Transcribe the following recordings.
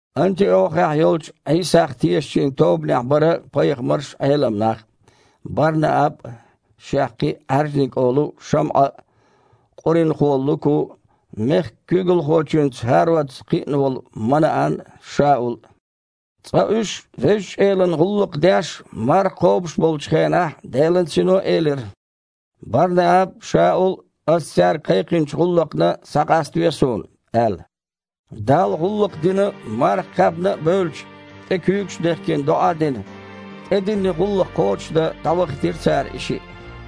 Антиохехь йолчу Іийсах тешачийн тобанехь бара пайхамарш а, Іелам нах а: Бар-Нааб а, шех кхин а Іаьржаниг олу ШамІа а, къуринахо Луку а, мехкан куьйгалхочуьнца ХІародца кхиъна волу Манаан а, Шаул а. Цкъа уьш Везачу Элана гІуллакх деш а, марха кхобуш а болчу хенахь Делан Сино элира: «Бар-Нааб а, Шаул а Ас цаьрга кхайкхинчу гІуллакхна схьакъаставе Суна», – аьлла. Далла гІуллакх дина а, марха кхаьбна а бевлча, тІе куьйгаш а дехкина, доІа а дина, тІедиллина гІуллакх кхочушдан дІавахийтира цара и шиъ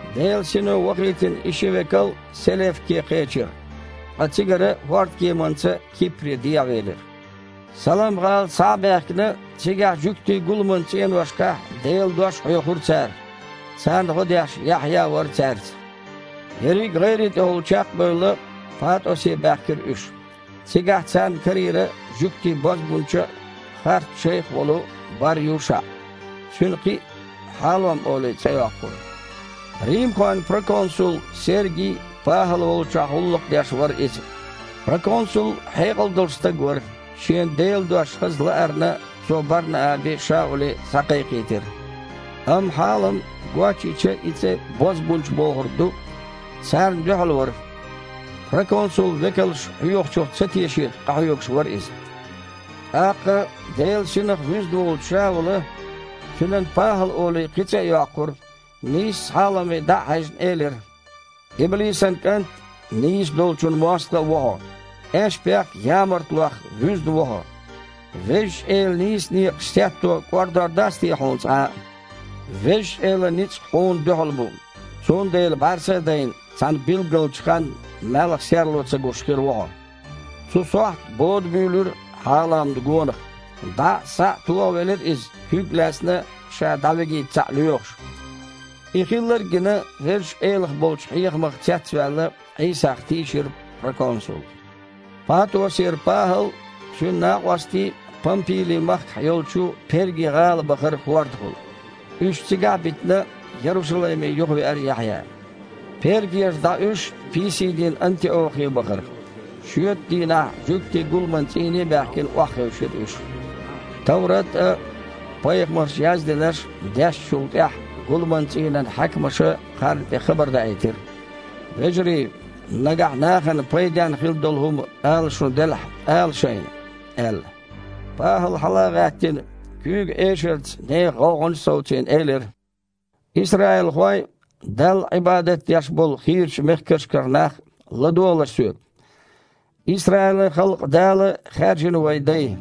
Делан Сино вахийтина и ши векал Селевке кхечира, ткъа цигара хІордан кеманца Кипре дехьавелира. Салам-гІала схьа а баьхкина, цигахь жуьгтийн гуламан цІеношкахь Делан Дош хьоьхура цара. Царна гІо деш Яхьъя а вара цаьрца. Ерриг а гІайре тІехула чекх а бевлла, ПатІосе баьхкира уьш. Цигахь царна карийра жуьгтийн бозбунча а, харц шайх а волу Бар-ЮшаІ. Цуьнан кхин а, Хьалом олий, цІе йоккхура. Римхойн проконсул Серги ПахІал волчохь гІуллакх деш вара иза. Проконсул хьекъал долуш стаг вара, шена Делан Дош хаза лаарна цо Бар-Наабе а, Шауле а схьакхайкхийтира. Амма Хьалом (гочйича и цІе «бозбунча» бохург ду) царна дуьхьал вара. Проконсул векалша хьоьхучух ца тешийта къахьоьгуш вара иза. ТІаккха Делан Синах вуьзна волчу Шаула (цуьнан, ПахІал олий, кхин цІе а йоккхура), нийсса Хьаломе дІа а хьаьжна, элира: «Иблисан кІант а, нийса долчун мостагІа а ву хьо! Аьшпех а, ямартлонах а вуьзна ву хьо. Везачу Элан нийса некъаш сетто кІордор дац те хьуна цкъа а? Везачу Элан ницкъ хьуна дуьхьал бу, цундела бІаьрса а дайна, цхьана билггалчу ханна малхан серло ца гуш хир ву хьо». Цу сохьта бода буьйлира Хьаломна гонах. ДІа а, схьа а тохавелира иза, куьг а лаьцна, ша дІавигийта цхьаъ лоьхуш. И хилларг а гина, Везачу Элах болчу хьехамах цецваьлла, Іийсах тийшира проконсул. ПатІосера ПахІал а, цуьнан накъостий а Пампили-махкахь йолчу Перги-гІала бахара хІордахула. Уьш цигахь а битина, Ярушалайме юхавеара Яхьъя. Пергера дІа уьш писидийн Антиохе бахара. Шоьтан дийнахь жуьгтийн гуламан цІийне а баьхкина, охьахевшира уьш. Товрат а, пайхамарша яздинарш а дешначул тІаьхьа гуламан цІийнан хьаькамаша кхарна тІе хабар даийтира: «Вежарий, нагахь нахана пайденна хин долу хІума ала шун делахь, ала шайна», – аьлла. ПахІала, хьала а гІаьттина, куьйган эшарца нехан гІовгІанаш а совцийна, элира: «Исраилхой а, Далла Іибадат деш болу хийрачу мехкашкара нах а, ладогІалаш соьга! Исраилан халкъан Дала хаьржина вайн дай.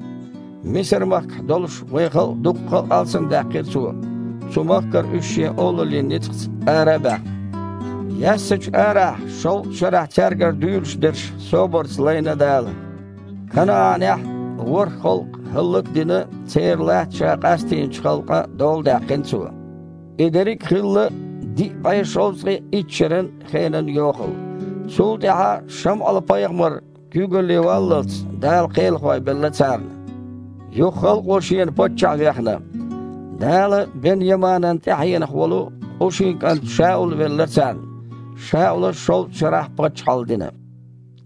Мисар-махкахь долуш вайн халкъ дуккха а алсамдаьккхина Цо, цу махкара уьш Шен олаллин ницкъаца ара а баьхна. Яьссачу арахь шовзткъа шарахь цаьргара дуьйлуш дерш собарца лайна Дала. КанаІанехь, ворхІ халкъ хІаллак а дина, церан латта Ша къастийначу халкъан доладаьккхина Цо. И дерриг а хилла диъ бІе шовзткъе итт шеран хенан йохалла. Цул тІаьхьа Шамъал-пайхамар куьйгалле вāллалц Дала кхелахой белла царна. Юха халкъо шена паччахь вехна. Дала Бен-Яманан тІаьхьенах волу Къушин кІант Шаул велла царна. Шаула шовзткъа шарахь паччахьалла дина.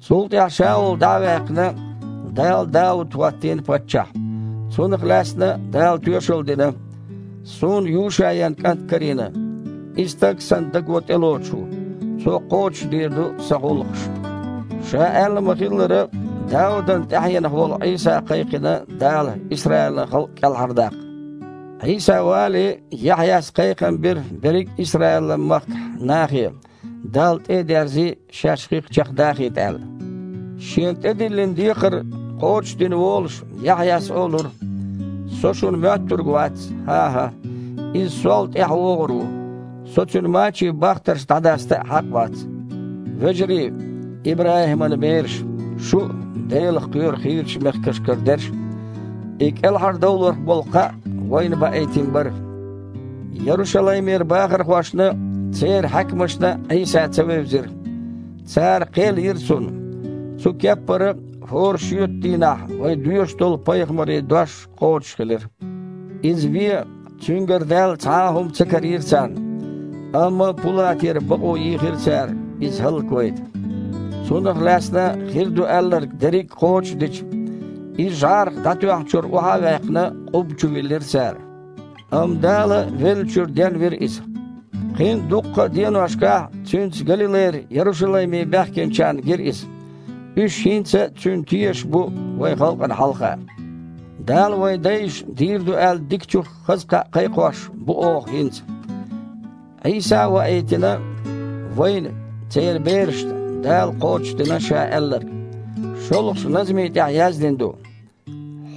Цул тІаьхьа Шаул дІа а ваьккхина, Дала Дауд хІоттийна паччахь. Цунах лаьцна Дала тоьшалла дина: „Суна Юшаян кІант карийна, и стаг Сан даго тІелоцуш ву. Цо кхочушдийр ду Сан гІуллакхаш“. Ша аьлла ма-хиллара, Даудан тІаьхьенах волу Іийса кхайкхина Дала Исраилан халкъ кІелхьардаккха. Іийса вале Яхьъяс кхайкхам бира берриг а Исраил-махкахь нахе, Далла тІе а дерзий, шаьш хих чекхдахийта аьлла. Шена тІедиллина декхар кхочушдина волуш, Яхьъяс олура: „Со шуна моьттург вац, хІан-хІа, Иза сол тІаьхьа вогІур ву, со Цуьнан мачийн бахтарш дІадаста а хьакъ вац“. Вежарий, ИбрахІиман бераш, шу а, Делах кхоьру хийрачу мехкашкара дерш, и кІелхьардовларх болу кхаъ вайна баийтина бара! Ярушалаймера бахархошна а, церан хьаькамашна а Іийса ца вевзира. Цара кхел йира Цунна. Цу кеппара, хІора шоьтан дийнахь вай доьшуш долу пайхамарийн дош кхочушхилира. Иза вен Цуьнгара даьлла цхьа а хІума ца карийра царна, амма Пулатера бакъо йийхира цара Иза хІаллаквайта. Цунах лаьцна хир ду аьлларг дерриг а кхочушдича, Иза жІарах дІатоьхначуьра охьа а ваьккхина, къубба чу виллира цара. Амма Дала веллачуьра денвира Иза. Кхин а дуккха а деношкахь Цуьнца Галилайра Ярушалайме баьхкинчарна гира Иза. Уьш хІинца Цуьнан тешаш бу вайн халкъана хьалха. Дала вайн дайшна дийр ду аьлла дикачух хаза кхаъ кхайкхош бу оха хІинца. Іийса а ваийтина, вайна, церан берашна, Дала кхочушдина Ша аьлларг. ШолгІачу назми тІехь яздина ду: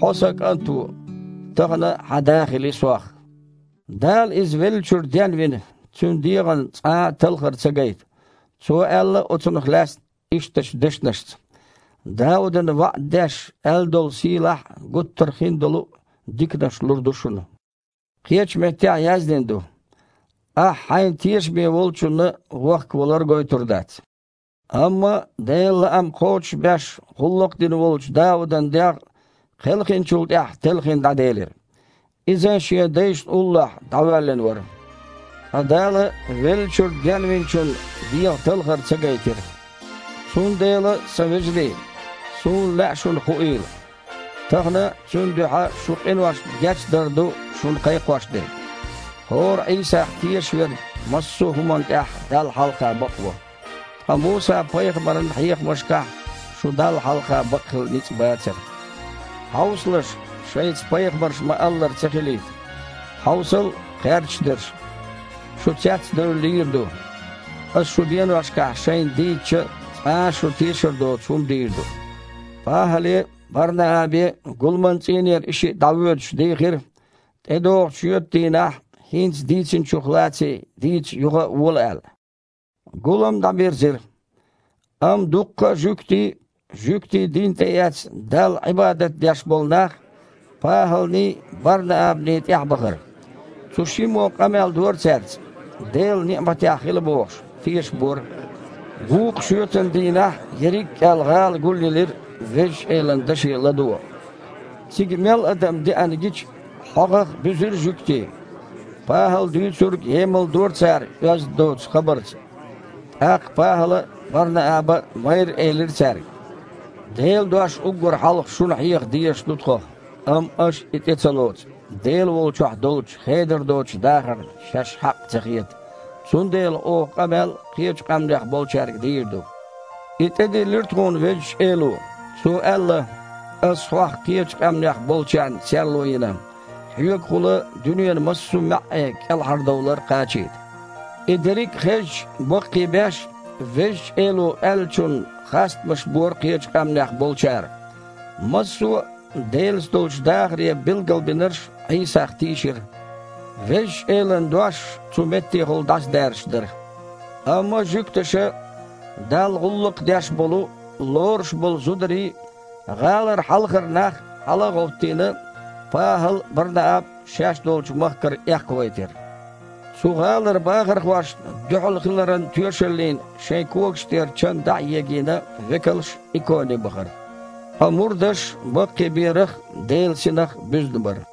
„Хьо Сан кІант ву, тахана Сох Хьан Да хилла!“ Дала Иза веллачуьра денвина, Цуьнан дегІана цкъа а талхар ца гайта. Цо аьлла оцунах лаьцна ишттачу дешнашца: „Даудана ваІда деш аьлла долу сийлахь а, гуттар хиндолу а диканаш лур ду шуна“. Кхечу меттехь яздина ду: „Ахьа Хьайна тешаме Волчунна дегІан талхар гойтур дац“. Амма Делан лаам кхочушбеш гІуллакх дина волчу Даудан дегІ кхелхинчул тІаьхьа телхина дІаделира. Иза шен дайшна уллохь дІавоьллина вара. Ткъа Дала веллачуьра Денвиначунна дегІан талхар ца гайтира! Цундела, сан вежарий, суна лаьа шуна хуийла, тахана Цуьнан дуьхьа шун къиношна гечдар ду шуна кхайкхош дерг. ХІора Іийсах тешаш верг массо а хІуманна тІехь Далла хьалха бакъво, ткъа Муса-пайхамаран хьехамашкахь шун Далла хьалха бакъхила ницкъ бацара. Хьовсалаш, шайца, пайхамарша ма-аллара, ца хилийта: „Хьовсал, кхаьрдаш дерш! Шу, цец а девлла, лийр ду. Аса шун деношкахь шайна дийцича а, цкъа а шу тешар доцу хІума дийр ду“». ПахІале а, Бар-Наабе а гуламан цІийнера и шиъ дІавоьдуш, дийхира, тІедогІучу шоьтан дийнахь хІинца дийцинчух лаций дийца юха а вола аьлла. Гулам дІабирзира, амма дуккха а жуьгтий а, жуьгтийн дин тІеэцна Далла Іибадат деш болу нах а ПахІалний, Бар-Наабаний тІаьхьабахара. Цу шиммо къамел дора цаьрца, Делан ниІматехь хила бохуш, тешабора. Вукху шоьтан дийнахь ерриг аьлла гІала гулъелира Везачу Элан даше ладогІа. Цига мел адам деана гича, хьогІах буьзира жуьгтий. ПахІала дуьйцург емалдора цара оьзда доцучу хабарца. ТІаккха ПахІала а, Бар-Нааба а майрра элира цаьрга: «Делан дош уггар хьалха шуна хьеха дезаш ду тхо. Амма аша и тІе а ца лоцу, Дела волчохь долчу хедар доцучу дахарна шаьш хьакъ а ца хета, цундела оха къамел кхечу къаьмнех болчаьрга дийр ду. И тІедиллира тхуна Везачу Эло. Цо аьлла: „Ас Хьох кхечу къаьмнех болчарна серло йина, Хьоьгахула дуьненан массо а маьІІе кІелхьардовлар кхачийта“». И дерриг а хезча, баккхийбеш, Везачу Эло аьллачунна хастамаш бора кхечу къаьмнех болчара. Массо а Делаца долчу дахаре билгалбинарш Іийсах тийшира. Везачу Элан дош цу меттехула дІасадаьржаш дара. Амма жуьгташа, Далла гІуллакх деш болу, лоруш болу зударий а, гІалара хьалхара нах а хьала а гІовттийна, ПахІал а, Бар-Нааб а шаьш долчу махкара эккхавайтира. Цу гІалара бахархошна дуьхьал хиларан тоьшаллина шайн когаш тІера чан дІа а егийна, векалш Иконе бахара. Ткъа мурдаш баккхийберах а, Делан Синах а буьзна бара.